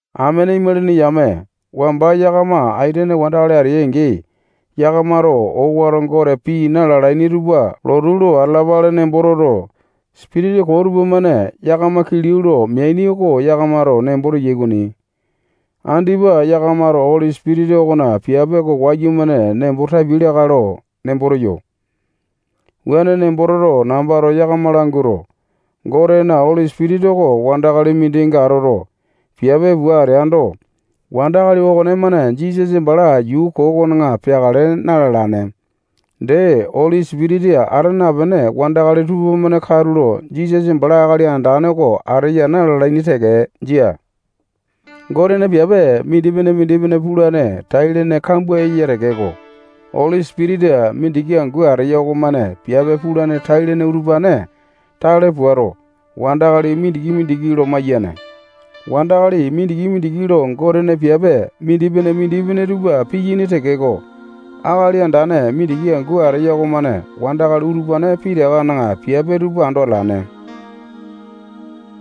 Amene imalini yame, wamba yakama aitene wandakali ateai-angi, yakamato owato gote pii na-lalaini tupa lotu lo atalapale nembo toto, sipitisa koo tupamane yakama kilau lo meaini oko yakamato nembo teyai okoni. Andipa yakamato Oli Sipitisa okona piape oko wayumane nembo tapiai lakae lo nembo teyo. Wuane nembo toto, nambato yakama languato, Gotena Oli Sipitisa oko wandakali mindinga atoto, piape pua ateando, wandakali okonemane Jisasa bala yuu koo okona peakale na-lalane. Dee, Oli Sipitisa ata napene wandakali tupamane katulo Jisasa bala Akali Andane oko ateya na-lalaini teke. Jia. Gotena piape mindipene-mindipene pulane tai-lene kambua eya tekeko, Oli Sipitisa mindiki angu ateya okomane piape pulane tai-lene utupane tale puato, wandakali mindiki-mindiki lo maiyane. Wandakali mindiki-mindiki lo Gotena piape mindipene-mindipene tupa piyaini tekeko, Akali Andane mindiki angu ateya okomane wandakali utupane pitakana piape tupa ando atalane.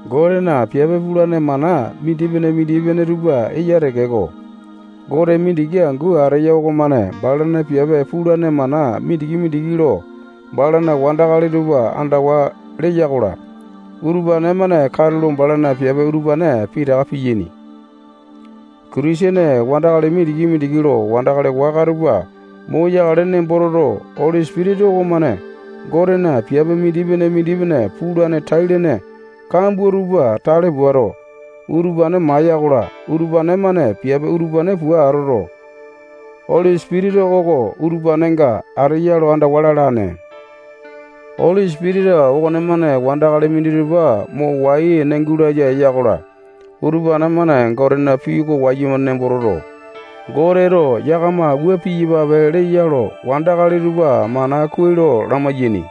Gotena piape pulane mana mindipene-mindipene tupa eya tekeko, Gote mindiki angu ateya okomane balana piape pulane mana mindiki-mindiki lo balana wandakali tupa andawa leya-kola, utupane-mane katulo balana piape utupane pitaka piyaini. Kitisene wandakali mindiki-mindiki lo wandakali waka tupa moyakale nemboto, Oli Sipitisa okomane Gotena piape mindipene-mindipene pulane tai-lene kambua tupa tale puato, utupane maiya-kola, utupane-mane piape utupane pua atoto, Oli Sipitisa oko utupanenga ateya lo andawa lalane. Oli Sipitisa okonemane wandakali minditupa mo wai-ene gulaya eya-kola, utupane-mane Gotena pii oko wayumane nembo toto, Goteto yakama wua piyapape leya lo wandakali tupa mana kuai lo lamai-yaini.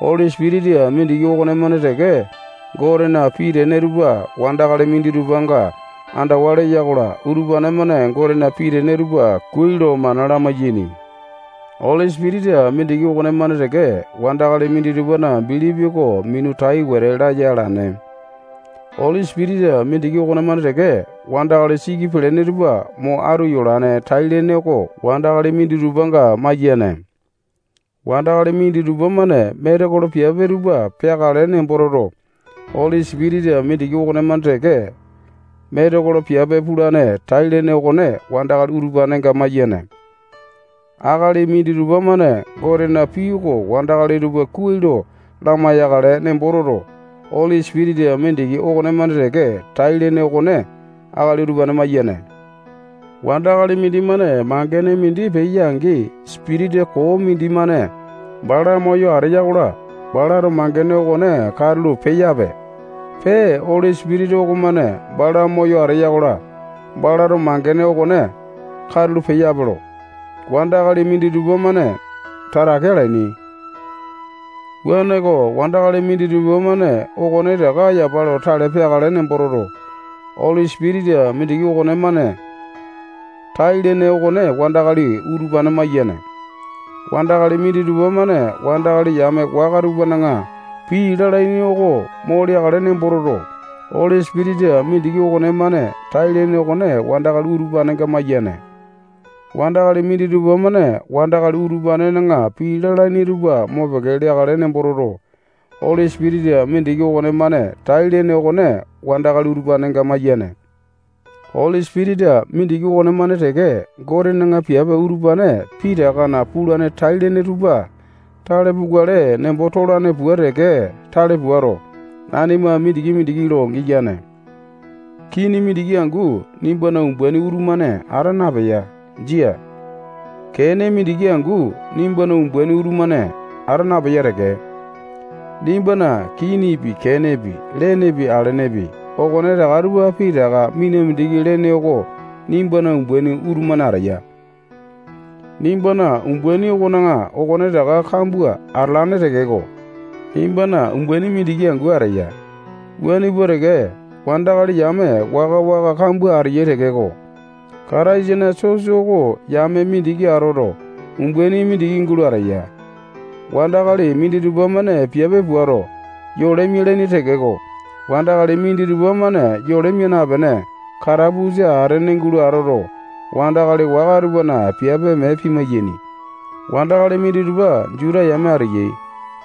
Oli Sipitisa mindiki okonemane teke Gotena pii tene tupa wandakali minditupanga andawa leya-kola, utupane-mane Gotena pii tene tupa kuai lo mana lamai-yaini. Oli Sipitisa mindiki okonemane teke wandakali minditupana bilipi oko minu tai wete laya alane. Oli Sipitisa mindiki okonemane teke wandakali siki pelene tupa mo atu yolane tai-lene oko wandakali minditupanga maiyane. Wandakali minditupa-mane metekolo piape tupa peakale nembo toto, Oli Sipitisa mindiki okonemane teke metekolo piape pulane tai-lene okone wandakali utupanenga maiyane. Akali minditupa-mane Gotena pii oko wandakali tupa kuai lo lamai-yakale nembo toto, Oli Sipitisa mindiki okonemane teke tai-lene okone akali utupane maiyane. Wandakali mindimane mangene mindi peya-angi, sipitisa koo mindimane bala moyo ateya-kola, balato mangene okone katulo peyape, pee Oli Sipitisa okomane bala moyo ateya-kola, balato mangene okone katulo peyape lo wandakali minditupa-mane tatake alalaini. Wuaneko, wandakali minditupa-mane okonetaka yapa lo tale peakale nembo toto, Oli Sipitisa mindiki okonemane tai-lene okone wandakali utupane maiyane. Wandakali minditupa-mane wandakali yame waka tupana pii lalaini oko mo leakale nembo toto, Oli Sipitisa mindiki okonemane tai-lene okone wandakali utupanenga maiyane. Wandakali minditupa-mane wandakali utupanena pii lalaini tupa mopeke leakale nembo toto, Oli Sipitisa mindiki okonemane tai-lene okone wandakali utupanenga maiyane. Oli Sipitisa mindiki okonemane teke Gotena piape utupane pitakana pulane tai-lene tupa tale pukale nembo tolane pua teke tale puato, nanima mindiki-mindiki lo giyane. Kini mindiki angu nimbana umbaini utumane ata napeya. Jia. Kene mindiki angu nimbana umbaini utumane ata napeya teke. Nimbana kinipi, kenepi, lenepi, alenepi, okonetaka tupa pitaka mina mindiki lene oko nimbana umbaini utumane ateya. Nimbana umbaini okona okonetaka kambua atalane tekeko, nimbana umbaini mindiki angu ateya. Wuane pua teke, wandakali yame waka-waka kambua ateyai tekeko, Kataisana sosa oko yame mindiki atoto, umbaini mindiki gulo ateya. Wandakali minditupa-mane piape puato, yole mialaini tekeko, wandakali minditupa-mane yole mia napene, katapusa atene gulo atoto, wandakali waka tupana piape mee pimai-yaini. Wandakali minditupa Juta yame ateyai.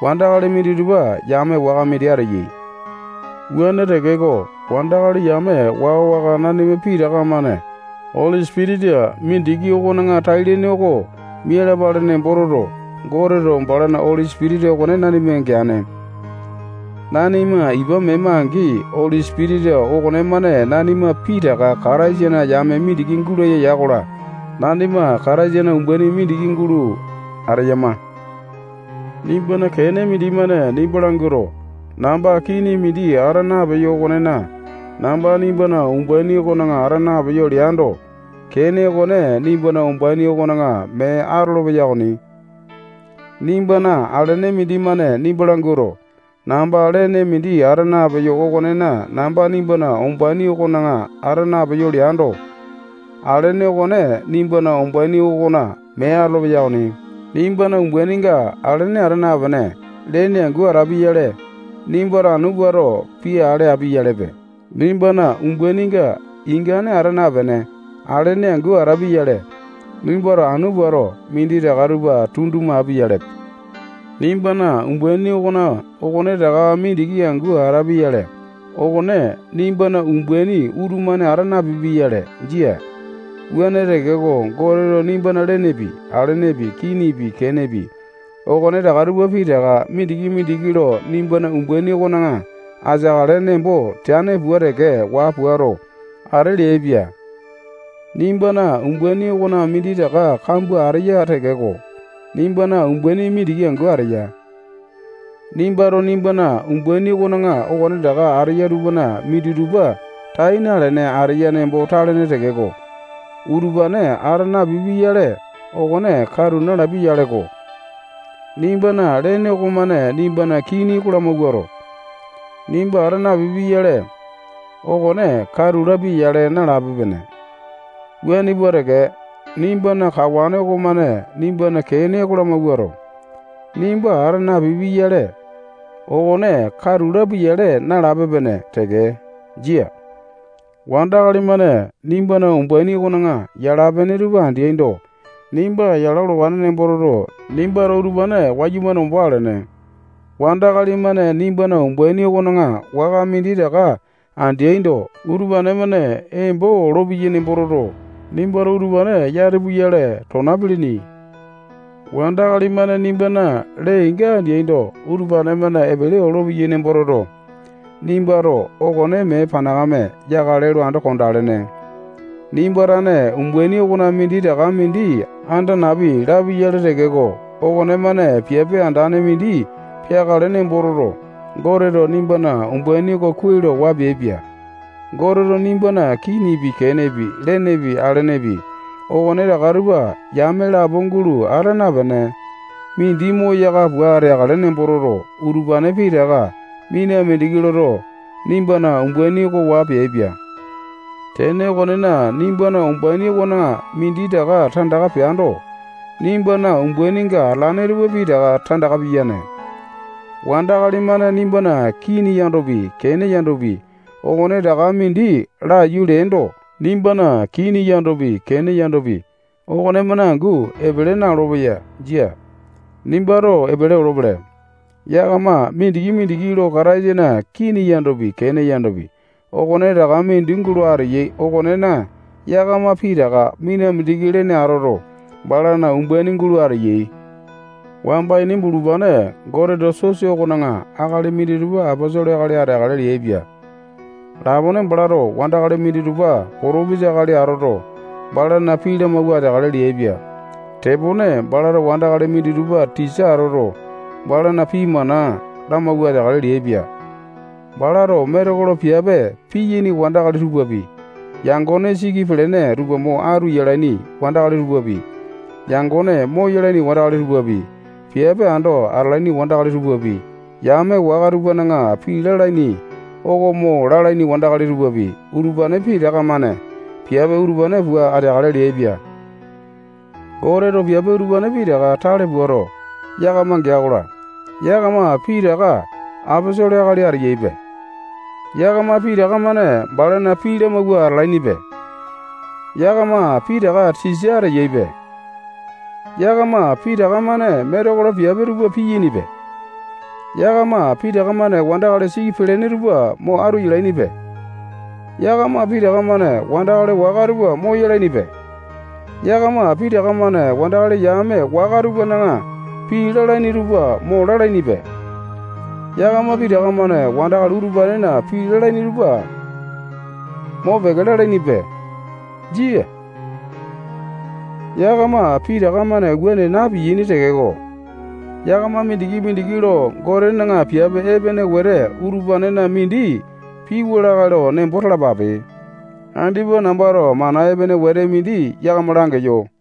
Wandakali minditupa yame waka mindi ateyai. Wuane tekeko, wandakali yame waka-waka nanima pitaka-mane Oli Sipitisa mindiki okona tai-lene oko mialapale nembo toto, Goteto balana Oli Sipitisa okone nanima geane. Nanima ipa mema-angi, Oli Sipitisa okonemane nanima pitaka Kataisana yame mindiki gulaya ya-kola, nanima Kataisana umbaini mindiki gulo ateyama. Nimbana kene mindimane nimba languato, namba kini mindi ata napeyo okonena, namba nimbana umbaini okona ata napeyo leando, kene okone nimbana umbaini okona mee atolopeya okoni. Nimbana alene mindimane nimba languato, namba lene mindi ata napeyo okonena, namba nimbana umbaini okona ata napeyo leando, alene okone nimbana umbaini okona mee atolopeya okoni. Nimbana umbaininga alene ata napene, lene angu atapia-yale, nimbato anu puato, pii ale api-yalepe. Nimbana umbaininga ingane ata napene, alene angu atapia-yale, nimbato anu puato, minditaka tupa tunduma api-yalepe. Nimbana umbaini okona okonetaka mindiki angu atapia-yale, okone nimbana umbaini utumane ata napipia-yale. Jia. Wuane tekeko, Goteto nimbana lenepi, alenepi, kinipi, kenepi, okonetaka tupa pitaka mindiki-mindiki lo nimbana umbaini okona ateakale nembo teane pua teke waa puato, ate leaipia. Nimbana umbaini okona minditaka kambua ateya tekeko, nimbana umbaini mindiki angu ateya. Nimbato nimbana umbaini okona okonetaka ateya tupana minditupa tai nalene ateya nembo talene tekeko, utupane ata napipia-yale, okone katu nalapia-yaleko. Nimbana lene okomane nimbana kini oko lamawuato, nimba ata napipi-yale, okone katu lapia-yale nalape-pene. Wuane pua teke, nimbana kawane okomane nimbana kene oko lamawuato, nimba ata napipi-yale, okone katu lapia-yale nalape-pene teke. Jia. Wandakali-mane nimbana umbaini okona yala-pene tupa andeaindo, nimba yala olowane nembo toto, nimbato utupane wayumane ombo alene. Wandakali-mane nimbana umbaini okona waka minditaka andeaindo, utupane-mane embo olopeyai nembo toto, nimbato utupane yati puyale, tona pilini. Wandakali-mane nimbana lee-inga andeaindo, utupane-mane epele olopeyai nembo toto, nimbato okone mee panakame yakale lo ando kondalene. Nimba tane umbaini okona minditaka mindi anda napi lapi-yale tekeko, okonemane piape andane mindi peakale nembo toto, Goteto nimbana umbaini oko kuai lo waa peaipia. Goteto nimbana kinipi, kenepi, lenepi, alenepi, okone taka tupa yame lapo gulo ata napene, mindi moyaka pua ateakale nembo toto, utupane pitaka mina mindiki loto, nimbana umbaini oko waa peaipia. Tene okonena, nimbana umbaini okona minditaka tandaka peando, nimbana umbaininga atalane tupa pitaka tandaka piyane. Wandakali-mane nimbana kini yandopi, kene yandopi, okonetaka mindi laiyu leaindo, nimbana kini yandopi, kene yandopi, okonemane angu epele na-olopeya. Jia. Nimbato epele olopele. Yakama mindiki-mindiki lo Kataisana kini yandopi, kene yandopi, okonetaka mindi gulo ateyai okonena, yakama pitaka mina mindiki lene atoto, balana umbaini gulo ateyai. Wamba ini bulupane Goteto sosa okona akali minditupa aposolo akali ateakale leaipia. Lapone balato wandakali minditupa potopisa akali atoto, balana pii lamawua ateakale leaipia. Tepone balato wandakali minditupa tisa atoto, balana pii mana lamawua ateakale leaipia. Balato metekolo piape piyaini wandakali tupapi, yangone siki pelene tupa mo atu yalaini wandakali tupapi, yangone moyalaini wandakali tupapi, piape ando atalaini wandakali tupapi, yame waka tupana pii lalaini oko mo lalaini wandakali tupapi, utupane pitaka-mane piape utupane pua ateakale leaipia. Goteto piape utupane pitaka tale puato, yakama gea-kola, yakama pitaka aposolo akali ateyaipe. Yakama pitaka-mane balana pii lamawua atalainipe. Yakama pitaka tisa ateyaipe. Yakama pitaka-mane metekolo piape tupa piyainipe. Yakama pitaka-mane wandakali siki pelene tupa mo atu yalainipe. Yakama pitaka-mane wandakali waka tupa moyalainipe. Yakama pitaka-mane wandakali yame waka tupana pii lalaini tupa mo lalainipe. Yakama pitaka-mane wandakali utupanena pii lalaini tupa mopeke lalainipe. Jia. Yakama pitaka-mane wuane na-piyaini tekeko, yakama mindiki-mindiki lo Gotena piape epene wete utupanena mindi piwa lakae lo nembo talapape. Andipa nambato mana epene wetete mindi yakama langeyo.